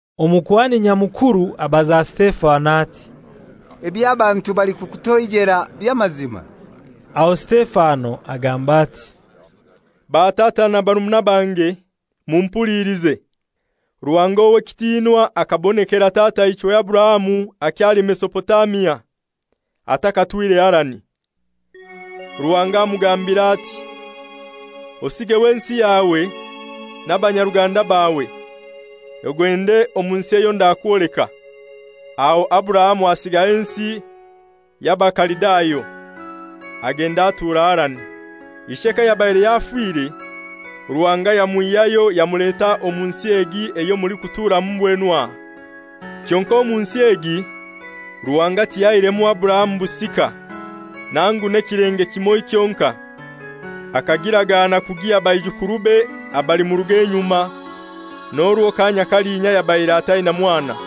Omukuhani Nyamukuru abaza Sitefano ati, «Ebyo abantu balikukutoijela by'amazima?» Aho Sitefano agamba ati, «Batata na barumuna bange, mumpulilize. Ruhanga ow'ekitinwa akabonekera tataichwe Aburahamu akyali Mesopotamia, atakatwire Harani. Ruhanga amugambira ati, ‹Osigeho ensi yawe n'abanyaruganda bawe, ogende omu nsi eyo ndakwoleka.› Aho Aburahamu asigaho ensi y'Abakalidayo, agenda atura Harani. Ishe kayabaire yafire, Ruhanga yamwihyayo yamuleta omu nsi egi eyo mulikuturamu mbwenu aha. Kyonkai omu nsi egi Ruhanga tiyahairemu Aburahamu busika, nangu n'ekilenge kimoi kyonkai. Akagiragana kugiha baijukurube abalimuruga enyuma, n'orwo kaanya kalinya yabaire ataina mwana.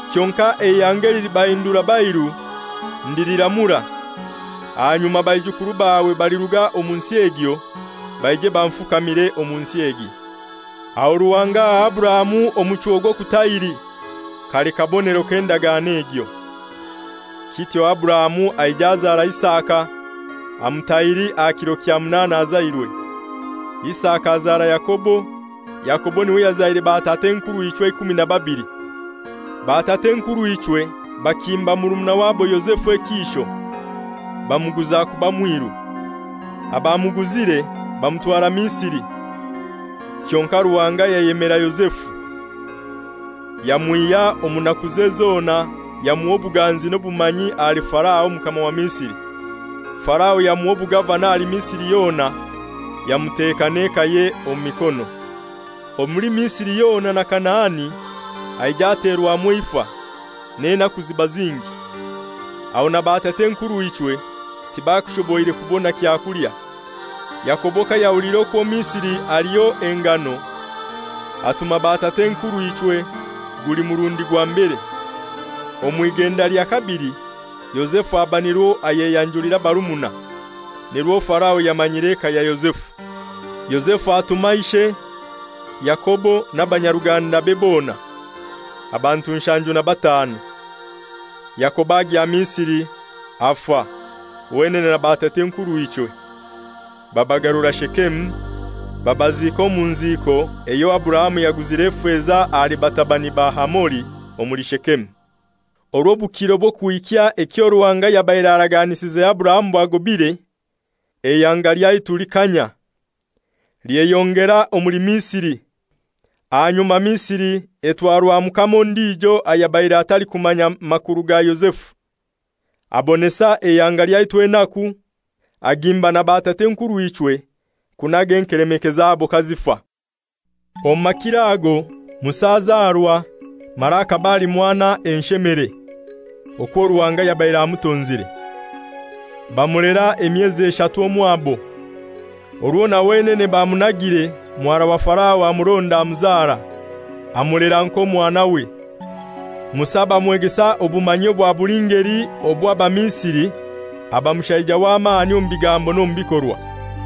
Kyonkai eihanga elilibahindura bairu ndiliramura, ahanyuma baijukuru bawe baliruga omu nsi egyo baije banfukamire omu nsi egi.› Aho Ruhanga aha Aburahamu omuchwo gw'okutahiri, kali kabonero k'endagano egyo. Kityo Aburahamu aija azara Isaka, amutahiri aha kiro kya munaana azairwe. Isaka azara Yakobo, Yakobo n'iwe yazaire batat'enkurw'ichwe eikumi na babili. «Batat'enkurw'ichwe bakimba murumuna wabo Yozefu ekiisho, bamuguza kuba mwiru, abamuguzire bamutwara Misiri. Kyonkai Ruhanga yayemera Yozefu, yamwihya omu nakuze zona, yamuha obuganzi n'obumanyi ahali Farao omukama wa Misiri. Farao yamuha obugavana ahali Misiri yona, yamuteka n'ekaye omu mikono. «Omuli Misiri yona na Kanaani haija haterwamu eifa, n'enaku ziba zingi. Aho na batatenkurw'ichwe tibakushoboire kubona kyakulya. Yakobo kayahuliire okwo Misiri aliyo engano, atuma batatenkurw'ichwe guli murundi gwa mbere. Omw'igenda lya kabili Yozefu aba nirwo ayeyanjulira abarumuna, nirwo Farao yamanyire eka ya Yozefu. Yozefu atuma ishe, Yakobo n'abanyarugandabe bona, abantu nshanju na batanu. Yakobo agya Misiri. Afa, wenene na batatenkurw'ichwe, babagarura Shekemu, babaziika omu nziiko eyo Aburahamu yaguzire efeza ahali batabani ba Hamori omuli Shekemu. «Orwo obukiro bw'okuhikya ekyo Ruhanga yabaire araganisize Aburahamu bwagobaire, eihanga lyaitu likanya, lyeyongera omuli Misiri. Ahanyuma Misiri etwarwa mukama ondijo ayabaire atalikumanya makuru ga Yozefu. Abonesa eihanga lyaitu enaku, agimba na batat'enkurw'ichwe kunaga enkelemeke zabo kazifa. Omu makiro ago Musa azarwa, mara akaba ali mwana enshemere, okwo Ruhanga yabaire amutonzire. Bamulera emyezi eshatu omwabo. Orwo na wenene bamunagire muhara wa Farao amuronda amuzara, amulera nk'omwanawe. Musa bamwegesa obumanyi bwa buli ngeli obw'Abamisiri, aba mushaija w'amani omu bigambo n'omu bikorwa.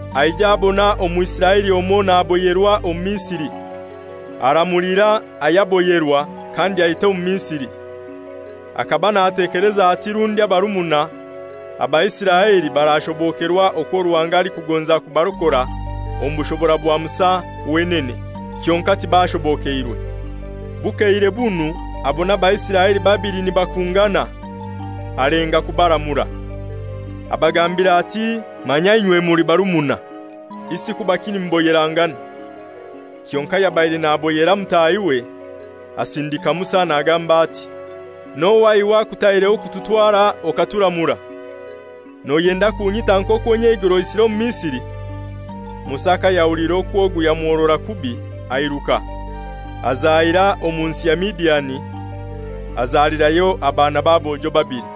Aija abona Omwisiraeli omoi naboyerwa Omumisiri, aramulira ayaboyerwa, kandi aita Omumisiri. Akaba natekeleza ati rundi abarumuna, Abaisiraeli barashobokerwa okwo Ruhanga alikugonza kubarokora omu bushobora bwa Musa wenene, kyonkai tibashobokeirwe. Bukeire bunu abona Abaisiraeli babili nibakungana, alenga kubaramura. Abagambira ati, ‹Manya inywe muli barumuna, isi kubaki nimuboyerangana?› Kyonkai ayabaire naboyera mutahiwe asindika Musa nagamba ati, ‹N'ohai iwe akutaireho kututwara okaturamura? Noyenda kunyita nk'okwo nyeigoro oisire Omumisiri?› Musa kayahuliire okwo ogu yamuhorora kubi airuka, azahira omu nsi ya Midiani, azalirayo abaana b'abojo babili.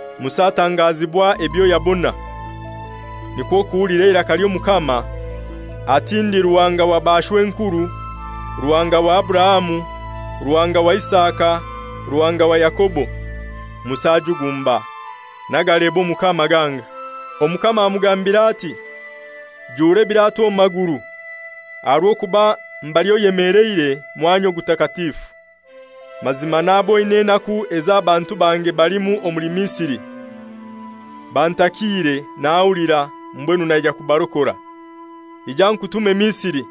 Musa atangazibwa ebyo yabona, nikwo kuhulira eiraka ly'Omukama, ati, ‹Ndi Ruhanga wa bashw'enkuru, Ruhanga wa Aburahamu, Ruhanga wa Isaka, Ruhanga wa Yakobo.› Musa ajugumba, n'agaleba Omukama ganga. Omukama amugambira ati, ‹Jura ebiratwa omu maguru, aha rw'okuba mbali oyemeleire mwanya Ogutakatifu. Mazima naboine enaku ezo abantu bange balimu omuli Misiri, bantakiire nahulira, mbwenu naija kubarokora. Ija nkutume Misiri.›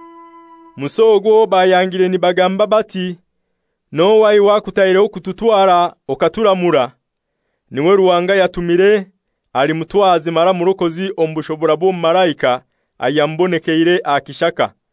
«Musa ogu owo bayangire nibagamba bati, ‹N'ohai iwe akutaireho kututwara okaturamura?› N'iwe Ruhanga yatumire ali mutwazi mara murokozi omu bushobora bw'omumalaika ayamubonekeire aha kishaka.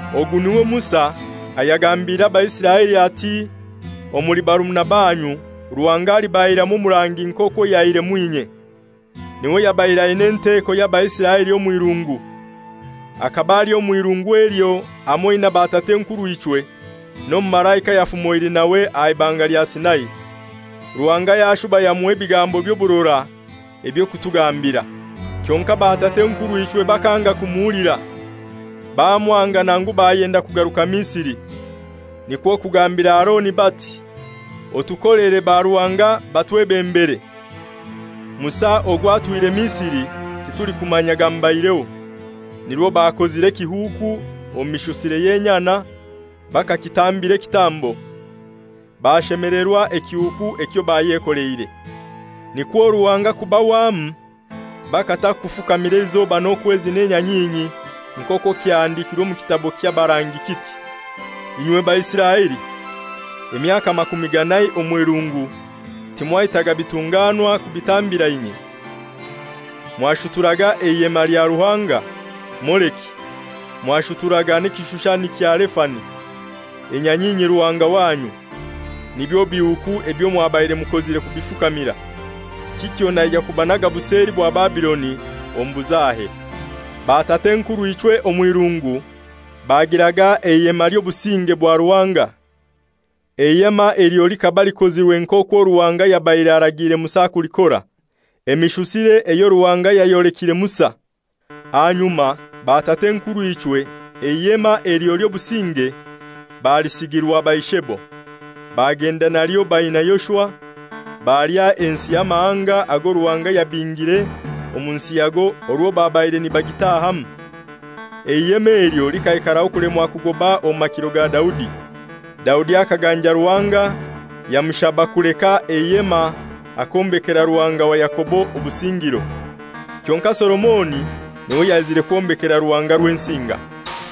Ogu n'iwe Musa ayagambiire Abaisiraeli ati, ‹Omuli barumuna banyu Ruhanga alibaihiramu omurangi nk'okwo yaihiremu inye.› N'iwe yabaire aina enteko y'Abaisiraeli omw'irungu. Akaba ali omw'irungu elyo hamoi na batat'enkurw'ichwe n'omumalaika ayafumoire nawe aha Ibanga lya Sinai, Ruhanga yashuba yamuha ebigambo by'oburora eby'okutugambira. «Kyonkai batat'enkurw'ichwe bakanga kumuhulira. Bamwanga nangu bayenda kugaruka Misiri. Nikwo kugambira Aroni bati, ‹Otukolere baruhanga batwebembere. Musa ogu atwihire Misiri titulikumanya gamubaireho.› Nirwo bakozire ekihuuku omu mishusire y'enyana, bakakitambira ekitambo, bashemelerwa ekihuuku ekyo bayekoleire. Nikwo Ruhanga kubahwamu, bakata kufukamira eizoba, n'okwezi n'enyanyinyi, nk'okwo kyahandikirwe omu kitabo ky'abarangi kiti, ‹Inywe Baisiraeli! Emyaka makumi ganai omw'irungu timwaitaga bitunganwa kubitambira inye. Mwashuturaga eihema lya ruhanga Moleki, mwashuturaga n'ekishushani kya Refani, enyanyinyi ruhanga wanyu. Nibyo bihuuku ebyo mwabaire mukozire kubifukamira. Kityo naija kubanaga buseli bwa Babiloni omu buzahe.› «Batat'enkurw'ichwe omw'irungu bagiraga Eihema ly'Obusinge bwa Ruhanga. Eihema elyo likaba likozirwe nk'okwo Ruhanga yabaire aragiire Musa kulikora, emishusire eyo Ruhanga yayolekire Musa. Ahanyuma batat'enkurw'ichwe Eihema elyo ly'Obusinge balisigirwa baishebo, bagenda nalyo baina Yoshua, balya ensi y'amahanga ago Ruhanga yabingire omu nsi yago orwo babaire nibagiitahamu. Eihema elyo likaikaraho kulemwa kugoba omu makiro ga Daudi. Daudi akaganja Ruhanga, yamushaba kuleka eihema akombekera Ruhanga wa Yakobo obusingiro. Kyonkai Solomoni n'iwe yaizire kwombekera Ruhanga Rwensinga.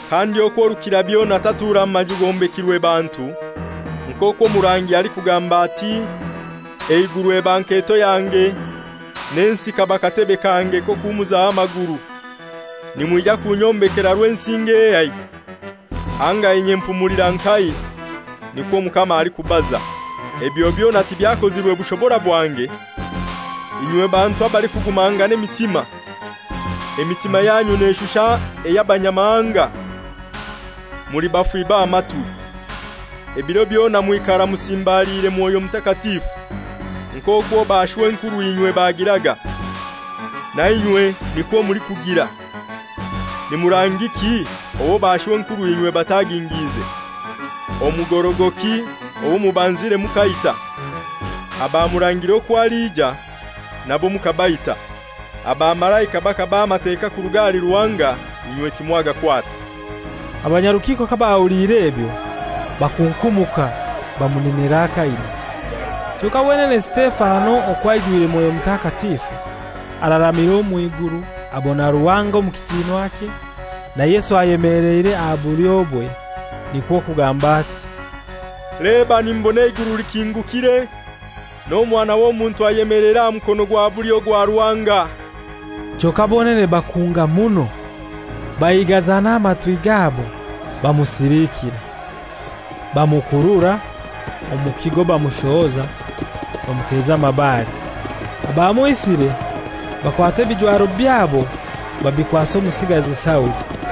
Kandi okwo Rukirabyona tatura mu maju gombekirwe bantu. Nk'okwo omurangi alikugamba ati, ‹Eiguru eba nketo yange, n'ensi kaba katebe kange k'okuhumuzaho amaguru. Nimwija kunyombekera Rwensinga ehai? Anga inye mpumulira nkahai? Nikwo Omukama alikubaza. Ebyo byona tibyakozirwe bushobora bwange?› «Inywe bantu abalikugumangana emitima! Emitima yanyu neshusha ey'Abanyamahanga; muli bafi b'amatwi; ebiro byona mwikara musimbaliire Mwoyo Mutakatifu. Nk'okwo bashwenkurw'inywe bagiraga, nainywe nikwo mulikugira. Ni murangiki owo bashwenkurw'inywe batagingiize? Omugorogoki owo mubanzire mukaita, abamurangire okwo aliija nabo mukabaita. Abamalaika bakabaha Amateka kuruga ahali Ruhanga inywe timwagakwata.» Abanyarukiiko kabahuliire ebyo bakunkumuka bamunenera akaino. Kyonkai wenene Sitefano okwo aijwirwe Mwoyo Mutakatifu, araramira omw'iguru abona Ruhanga omu kitinwakye, na Yesu ayemeleire aha bulyobwe. Nikwo kugamba ati, «Leba nimbona eiguru likingukire, n'Omwana w'Omuntu ayemeleire aha mukono gwa bulyo gwa Ruhanga.» Kyonkai bonene bakunga muno, baigaza n'amatwi gabo, bamusiliikira. Bamukurura omu kigo bamushohoza, bamuteza amabare. Abamwisire bakwata ebijwaro byabo babikwasa omusigazi Sauli.